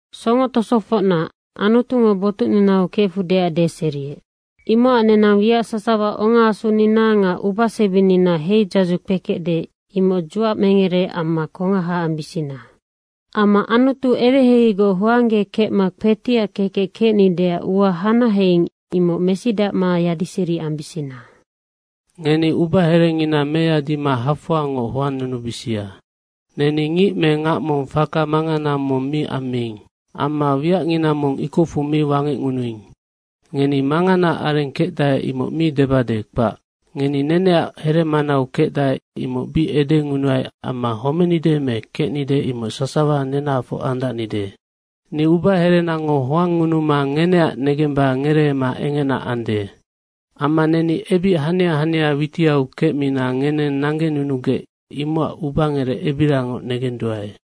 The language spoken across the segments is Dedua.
Songo tosofocna, Anutungo botucninau kefudeac deseriec, imocac nenang wiac sasawa ongaasunina nga ubasebinina heidzadzu kpekecde, imoc dzuacmengere amma kongaha ambisina. Amma Anutu eweheiheigoc hoanggekecma kpetiac kekec kecnideac ua hanaheing, imoc mesidacma yadiseri ambisina. Ngeni ubaherengina meyadima hafoangoc hoannunubisia. Neni ngic me ngac mong faka mangana mi ammiing. Amma wiacngina mong ikocfu mi wangecngunuing. Ngeni manganaac areng kecdae, imoc mi debade, kpac. Ngeni neneac heremanau kecdae, imoc bic edengunuai amma homenide me kecnide, imoc sasawa nenahafoc andacnide. Ni ubaherenango hoangngunuma ngeneac negemba ngereema engena ande. Amma neni ebic hania hania witiau kecmina ngeneng nanggenunugec, imocac ubangerec ebirangoc negenduae.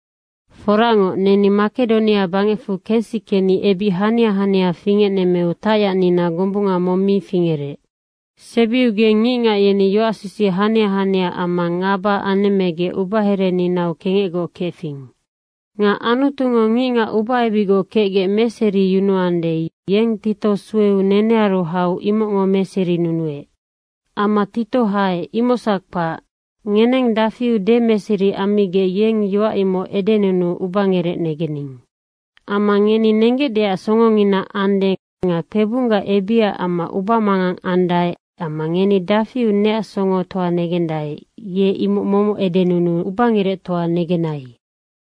Foracngoc, neni Makedonia bangecfu kensikeni ebic hania hania fingecnemmeu tacyacnina gombunga mong mi fingerec. Sebiugeng ngicngac yeni yoacsisic hania hania amma ngaba anemmegec ubahereninau kengecgoc kefing. Nga Anutungo ngicngac ubaebicgoc kecgec meseriyunuande, yeng Tito sueu nenearu hau imocngo meserinunuec. Amma Tito haec, imocsac kpac, ngeneng dafiu demeseri ammigec, yeng yoac imoc edenunuu ubangerec negening. Amma ngeni nenggecdeac songongina ande nga kpebunggac ebicac amma ubamangang andae amma ngeni dafiu neac songotoa negendae, ye imoc momoc edenunuu ubangerectoa negenai.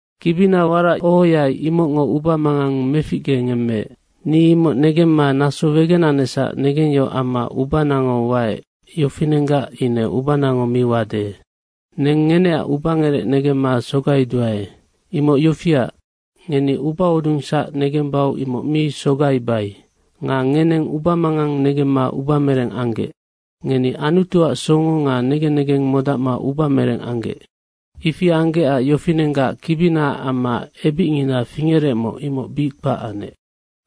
Kibina warac ohoai, imocngo ubamangang meficgengemmeec. Ni imoc negemma naso wegenanecsac negengyohoc amma ubanango waec, yofinenggac ine ubanango mi wade. Neng ngeneac ubangerec negemma sogaiduae. Imoc yofiac, ngeni ubahodungsac negembau imoc mi sogaibai. Nga ngeneng ubamangang negemma ubamereng anggec. Ngeni Anutuac songo nga negen negeng modacma ubamereng anggec. Ifi anggecac yofinenggac kibininaac amma ebicngina fingerecmoc, imoc bic kpac anec.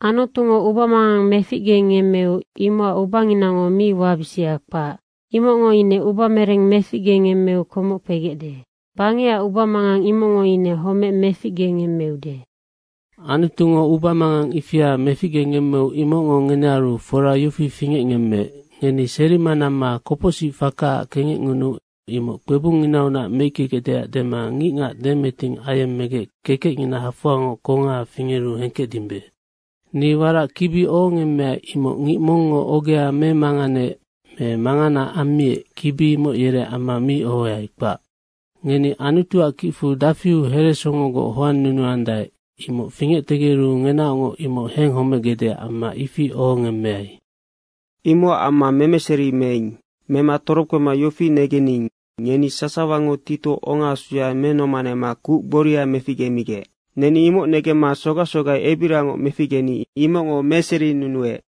Anutungo ubamangang meficgengemmeu imocac ubanginango mi wabisia, kpac. Imocngo ine ubamereng meficgengemmeu komoc kpegecde. Bangecac ubamangang, imocngo ine homec meficgengemmeude. Anutungo ubamangang ifia meficgengemmeu imocngo ngenearu fora yofi fingecngemmeec, ngeni serima namma kopocsicfakaac kengecngunuu imoc kpebungnginaunac meickegecdeac dema ngicngac demeting ayemmegec kekecngina hafoangoc kongaha fingeru hengkecdimbe. Ni warac kibi ohongemmeai, imoc ngic mongngo ogea memanganeec me mangana ammiec, kibi imoc yereac amma mi ohoai, kpac. Ngeni Anutuac kicfu dafiu heresongogoc hoannunuandae, imoc fingectegeru ngenaocngoc imoc henghomegecdeac amma ifi ohongemmeai. Imocac amma memeseri meing. Mema torokpema yofi negening, ngeni sasawango Tito ongaasuya menomanema kuc gboria meficgemigec. Neni imoc negemma sogac sogai ebirangoc meficgeni imocngo meserinunuec.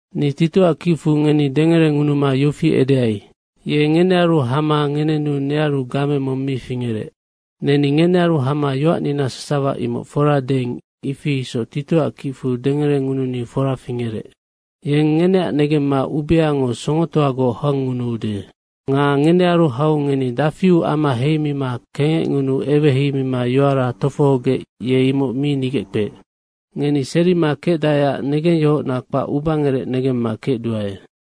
Ni Titoac kicfu ngeni dengerengunuma yofi edeai, ye ngenearu hama ngenenu nearu game mong mi fingerec. Neni ngenearu hama yoacnina sasawa imoc fora deing, ifi isoc Titoac kicfu dengerengununi fora fingerec. Yeng ngeneac negemma ubeango songotoagoc hoangngunuude. Ye ngenearu hau ngeni dafiu ama heimima kengecngunuu eweheimima yoara tofohogec, ye imoc mi nigeckpeec. Ngeni serima kecdaeac negengyohocna kpac ubangerec negemma kecduae.